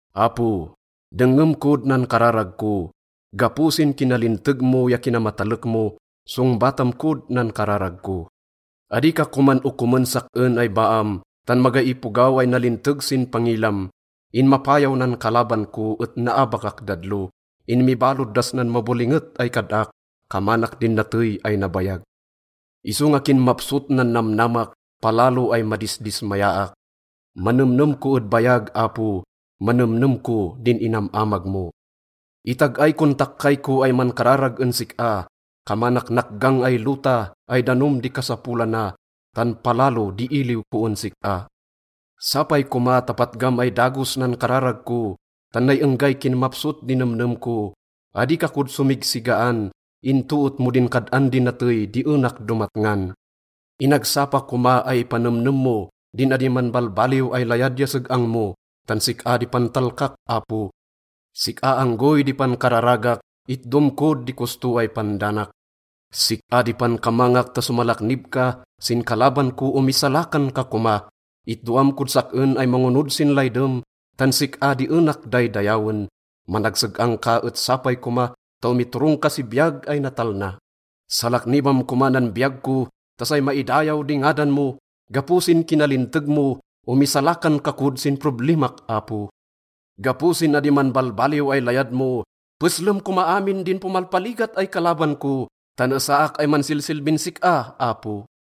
Apo, dengngem kod nan kararag ko. Gapo sin kinalinteg mo ya kinamatalek mo, songbatam kod nan kararag ko. Adi ka koman okomen sak-en ay baam, tan magay ipogaw ay nalinteg sin pangilam. Inmapayaw nan kalaban ko et naabakak dadlo. Inmibalod das nan mabolinget ay kad-ak, kamanak din natey ay nabayag. Isonga kinmapsot nan namnamak, palalo ay madisdismayaak. Manemnem ko ed bayag, Apo, manemnem ko din inam-amag mo. Itag-ay kon takkay ko ay mankararag en sik-a, kamanak nakgang ay lota ay danom di kasapolana, tan palalo di iliw ko en sik-a. Sapay koma ta patgam ay dagos nan kararag ko, tan nay enggay kinmapsot di nemnem ko. Adi ka kod somigsigaan into et mo din kad-an di natey di enak domatngan. Inagsapa koma ay ipanemnem mo din adi manbalbaliw ay layad ya seg-ang mo, tan sik-a di pantalkak, Apo. Sik-a anggoy di pankararagak, itdom kod di kosto ay pandanak. Sik-a di pankamangak ta somalaknib ka, sin kalaban ko, omisalakan ka koma. Itdoam kod sak-en ay mangonod sin laydem, tan sik-a di enak daydayawen. Managseg-ang ka et sapay koma ta omiturong ka si biyag ay natalna. Salaknibam koma nan biyag ko ta say maidayaw di ngadan mo. Gapo sin kinalinteg mo, omisalakan ka kod sin problimak, Apo. Gapo sin adi manbalbaliw ay layad mo, peslem koma amin din pomalpaligat ay kalaban ko, tan esaak ay mansilsilbin sik-a, Apo.